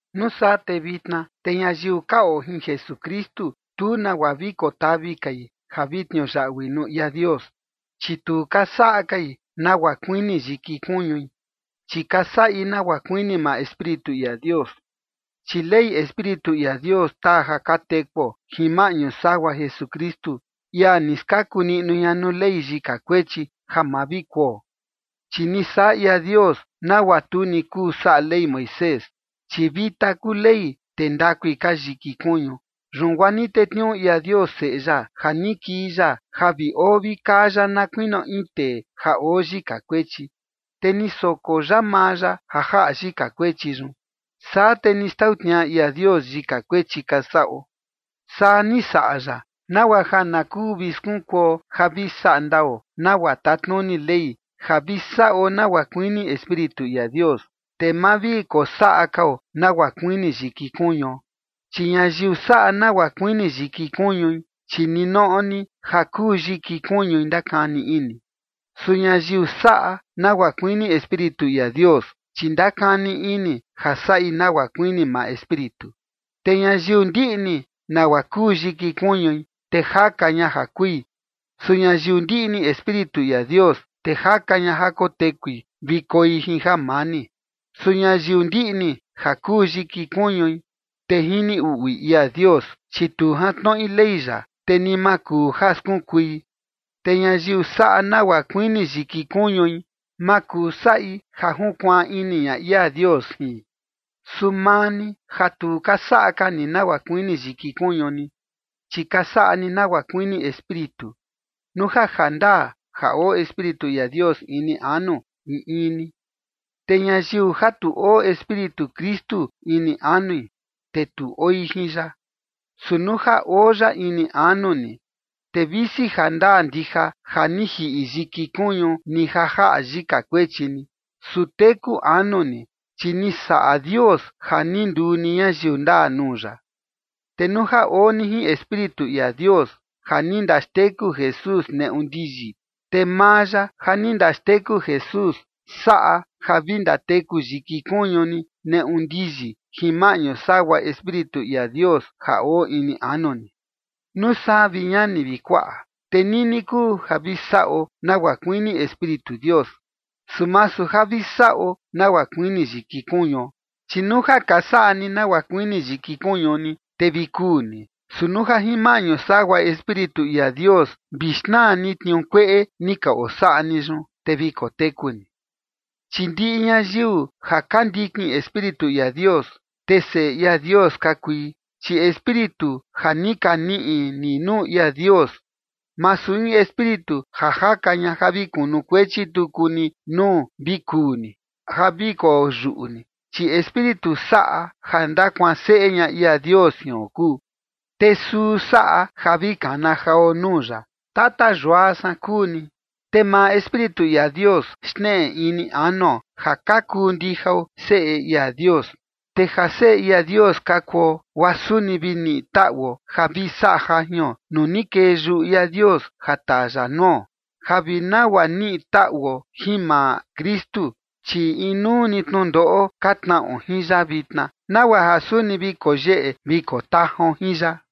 Nuu saa te vitna, te ñayiu ka oo jin Jesukristu, tu nagua vi kotavi kai ja vi tniuyaꞌui nuu ia Dios, chi tu ka saꞌa kai nagua kuini yiki kuñui, chi ka saꞌi nagua kuini maa Espíritu ia Dios. Chi ley Espíritu ia Dios taa ja ka tekuo jin maꞌñu sagua Jesukristu, ia ni skaku niꞌnu ña nuu ley yika kuechi ja ma vi kuo. Chi ni saꞌa ia Dios nagua tu ni kuu saꞌa Ley Moisés, chi vita kuu Ley, te ndakui ka yiki kuñu. Yun guaa ni tetniuu ia Dios Seꞌe ya ja ni kii ya ja vi oo vi kaa ya na kuinio in tee ja oo yika kuechi. Te ni soko ya maa ya ja jaꞌa yika kuechi yun, saa te ni xtau tniaꞌa ia Dios yika kuechi ka saꞌo. Saa ni saꞌa ya, nagua ja na kuu vi skunkuo ja vi saꞌa ndao nagua tatnuni ley, ja vi saꞌo nagua kuini Espíritu ia Dios, te ma vi kosaꞌa kao nagua kuini yiki kuñuo. Chi ñayiu saꞌa nagua kuini yiki kuñui, chi ninoꞌo ni ja kuu yiki kuñui ndakani ini. Su ñayiu saꞌa nagua kuini Espíritu ia Dios, chi ndakani ini ja saꞌi nagua kuini maa Espíritu. Te ñayiu ndiꞌni nagua kuu yiki kuñui, te jaka ña ja kui. Su ñayiu ndiꞌni Espíritu ia Dios, te jaka ña ja kotekui vi koi jin jamani. Su ñayiu ndiꞌni ja kuu yiki kuñui, te jini uꞌui ia Dios, chi tu jantnoꞌi ley ya, te ni ma kuu ja skunkui. Te ñayiu saꞌa nagua kuini yiki kuñui, ma kuu saꞌi ja junkuaan ini ña ia Dios jin. Su maa ni, ja tu ka saꞌa ka ni nagua kuini yiki kuñu ni, chi ka saꞌa ni nagua kuini Espíritu, nuu ja jandaa ja oo Espíritu ia Dios ini anu in in ni. Te ñayiu ja tu oo Espíritu Kristu ini anui, te tu oi jin ya. Su nuu ja oo ya ini anu ni, te visi jandaa ndija ja ni jiꞌi yiki kuñu ni ja jaꞌa yika kuechi ni, su teku anu ni, chi ni saꞌa Dios ja ni nduu ni ñayiu ndaa nuu ya. Te nuu ja oo ni jin Espíritu ia Dios, ja ni ndaxteku Jesús neꞌu ndiyi, te maa ya ja ni ndaxteku Jesús saꞌa ja vi ndateku yiki kuñu ni neꞌu ndiyi jin maꞌñu sagua Espíritu ia Dios ja oo ini anu ni. Nuu saa, vi ñani vi kuaꞌa, te nini kuu ja vi saꞌo nagua kuini Espíritu Dios, su masu ja vi saꞌo nagua kuini yiki kuñuo. Chi nuu ja ka saꞌa ni nagua kuini yiki kuñu ni, te vi kuu ni. Su nuu ja jin maꞌñu sagua Espíritu ia Dios vi xnaa ni tniuu kueꞌe ni ka osaꞌa ni yun, te vi koteku ni. Chi ndiꞌi ñayiu ja ka ndikin Espíritu ia Dios, te seꞌe Dios ka kui. Chi Espíritu ja ni ka niꞌi ni nuu ia Dios, masu in espíritu ja jaka ña ja vi kunukuechi tuku ni nuu vi kuu ni, ja vi koyuꞌu ni, chi Espíritu saꞌa ja ndakuanseꞌe ña ia Dios jion kuu, te suu saꞌa ja vi kana jao nuu ya: “Tata yua san kuu ni”. Te maa Espíritu ia Dios xneꞌe ini anuo, ja ka kuu ndijao seꞌe ia Dios. Te ja seꞌe ia Dios ka kuo, guaa suni vi niꞌi taꞌuo ja vi saꞌa jajion nuu ni kee yuꞌu ia Dios ja taa ya nuo, ja vi nagua niꞌi taꞌuo jin maa Kristu, chi inuu ni tnundoꞌo ka tnaꞌo jin ya vitna, nagua ja suni vi koo yeꞌe vi koo tajaon jin ya.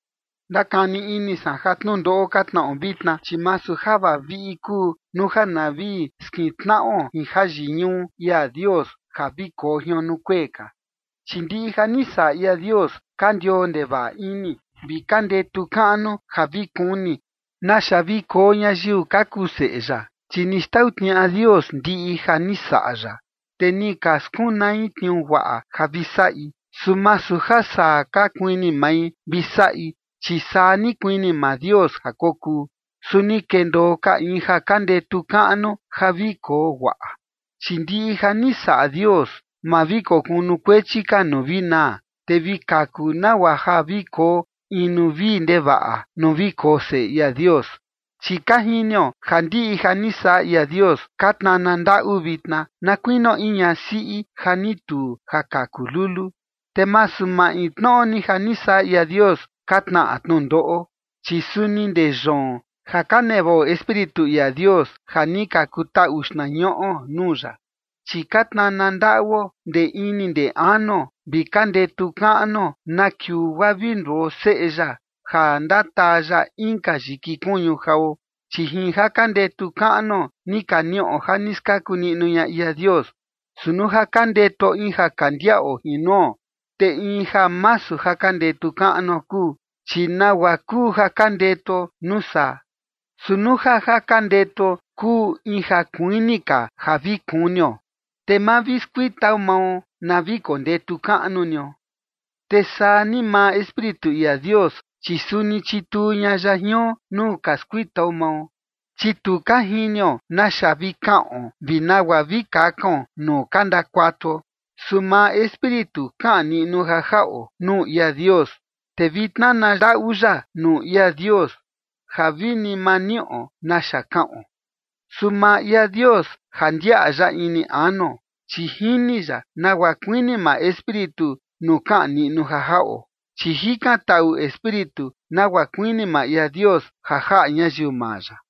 Ndakani ini san ja tnundoꞌo ka tnaꞌo vitna, chi masu ja vaviꞌi kuu, nuu ja na vi skintnaꞌo jin jayiñuꞌu ia Dios ja vi koo jion nuu kuee ka. Chi ndiꞌi ja ni saꞌa ia Dios ka ndioo ndevaꞌa ini, vi ka ndetu kaꞌnu ja vi kuni naxa vi koo ñayiu ka kuu seꞌe ya. Chi ni xtau tniaꞌa Dios ndiꞌi ja ni saꞌa ya, te ni ka skunai tniuu guaꞌa ja vi saꞌi, su masu ja saa ka kuini mai vi saꞌi, chi saa ni kuini maa Dios ja kokuu. Su ni kendoo ka in ja ka ndetu kaꞌnu ja vi koo guaꞌa. Chi ndiꞌi ja ni saꞌa Dios ma vi kokunukuechi ka nuu vi naa, te vi kaku nagua ja vi koo in nuu vii ndevaꞌa, nuu vi koo seꞌe ia Dios. Chi ka jinio ja ndiꞌi ja ni saꞌa ia Dios ka tnana ndaꞌu vitna, na kuinio in ñasiꞌi ja ni tuu ja kaku lulu. Te masu maintnoꞌo ni ja ni saꞌa ia Dios ka tnaꞌa tnundoꞌo, chi suni ndee yoon, ja ka nevaꞌo Espíritu ia Dios ja ni ka kutaꞌu xtnañuꞌo nuu ya, chi ka tnana ndaꞌuo ndee ini ndee anuo, vi ka ndetu kaꞌnuo na kiuu guaa vi nduo seꞌe ya ja ndataa ya inka yiki kuñu jao. Chi jin ja ka ndetu kaꞌnuo ni ka niꞌo ja ni skaku niꞌnu ña ia Dios. Su nuu ja ka ndetuo in ja kandiaꞌo jin nuo, te in ja masu ka ndetu kaꞌnuo kuu. Chi ¿nagua kuu ja ka ndetuo nuu saa? Su nuu ja ja ka ndetuo kuu in ja kuini ka ja vi kunio, te ma vi skuitao mao na vi kondetu kaꞌnu nio. Te saa ni maa Espíritu ia Dios, chi suni chituu ña ya jion nuu ka skuitao mao, chi tu ka jinio naxa vi kaꞌon vi nagua vi kakaon nuu ka ndakuatuo. Su maa Espíritu kaꞌan niꞌnu ja jaꞌo nuu ia Dios, te vi tnana ndaꞌu ya nuu ia Dios ja vi ma niꞌo naxa kaꞌon. Su maa ia Dios ja ndiaꞌa ya ini anuo, chi jini ya nagua kuini maa Espíritu nuu kaꞌan niꞌnu ja jaꞌo. Chi jikan taꞌu Espíritu nagua kuini maa ia Dios ja jaꞌa ñayiu maa ya.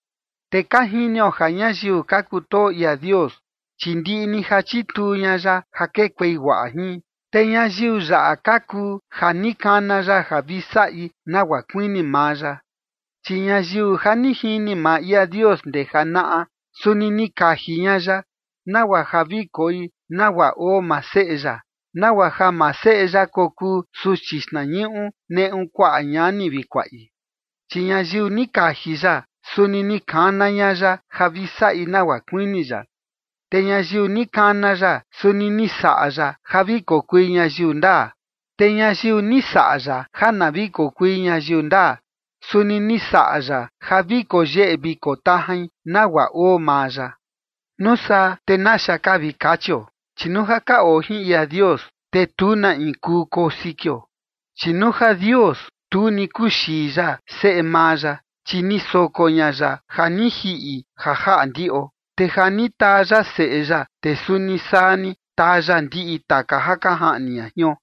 Te ka jinio ja ñayiu ka kutoo ia Dios, chi ndiꞌi ni ja chituu ña ya ja kekuei guaꞌa jin, te ñayiu yaꞌa ka kuu ja ni kana ya ja vi saꞌi nagua kuini maa ya. Chi ñayiu ja ni jini maa ia Dios ndee janaꞌa, suni ni kaji ña ya nagua ja vi koi nagua oo maa Seꞌe ya, nagua ja maa Seꞌe ya kokuu suchi xtnañuꞌu neꞌu kuaꞌa ñani vi kuaꞌi. Chi ñayiu ni kaji ya, suni ni kana ña ya ja vi saꞌi nagua kuini ya. Te ñayiu ni kana ya suni ni saꞌa ya ja vi kokui ñayiu ndaa. Te ñayiu ni saꞌa ya ja na vi kokui ñayiu ndaa, suni ni saꞌa ya ja vi koyeꞌe vi kotajain nagua oo maa ya. Nuu saa, ¿te naxa ka vi kachio? Chi nuu ja ka oo jin ia Dios, te tu na in kuu koo sikio. Chi nuu ja Dios, tu ni kuxii ya Seꞌe maa ya, chi ni soko ña ya ja ni jiꞌi ja jaꞌa ndiꞌo. Te ja ni taa ya Seꞌe ya, te suni saa ni taa ya ndiꞌi taka ja ka jaꞌni ña jion.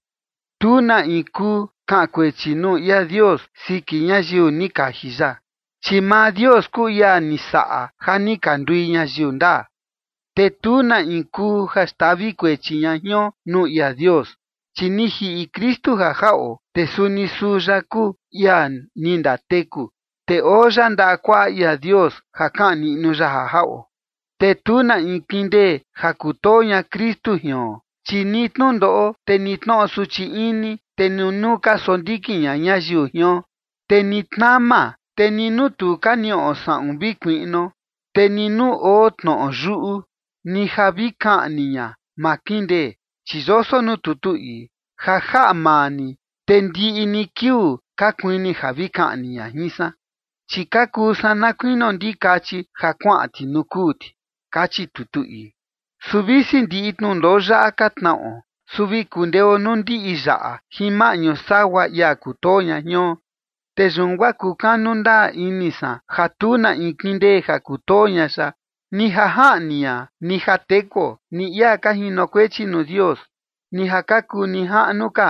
Tu na in kuu kaꞌan kuechi nuu ia Dios siki ñayiu ni kaji ya, chi maa Dios kuu ia ni saꞌa ja ni ka ndui ñayiu ndaa. Te tu na in kuu ja xtavi kuechi ña jion nuu ia Dios, chi ni jiꞌi Kristu ja jaꞌo. Te suni suu ya kuu ia ni ndateku. Te oo ya ndaꞌa kuaꞌa ia Dios ja kaꞌan niꞌnu ya ja jaꞌo. Te tu na in kindee ja kutoo ña Kristu jion. Chi ni tnundoꞌo, te ni tnoꞌo suchi ini, te ni nuu ka sondikin ña ñayiu jion, te ni tnama, te ni nuu tu ka niꞌo saꞌun vi kuiꞌnuo, te ni nuu oo tnoꞌo yuꞌu, ni ja vi kaꞌni ña, ma kindee. Chi yoso nuu tutu ii: Ja jaꞌa maa ni te ndiꞌi ni kiuu ka kuini ja vi kaꞌni ña jin san, chi ka kuu san na kuinio ndikachi ja kuaꞌan ti nuu kuu ti, kachi tutu ii. Su visi ndiꞌi tnundoꞌo yaꞌa ka tnaꞌo, su vi kundeo nuu ndiꞌi yaꞌa jin maꞌñu sagua ia kutoo ña jion. Te yun guaa kukanu ndaa ini san ja tu na in kindee ja kutoo ña ya. Ni ja jaꞌni ña, ni ja tekuo, ni ia ka jinokuechi nuu Dios, ni ja ka kuu nijaꞌnu ka,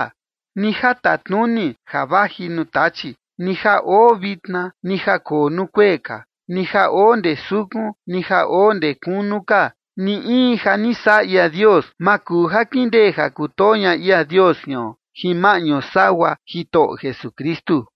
ni ja tatnuni ja vaji nuu Tachi, ni ja oo vitna, ni ja koo nuu kuee ka, ni ja oo ndee sukun, ni ja oo ndee kunu ka, ni in ja ni saꞌa ia Dios, ma kuu ja kindee ja kutoo ña ia Dios jion, jin maꞌñu sagua Jitoꞌo Jesukristu.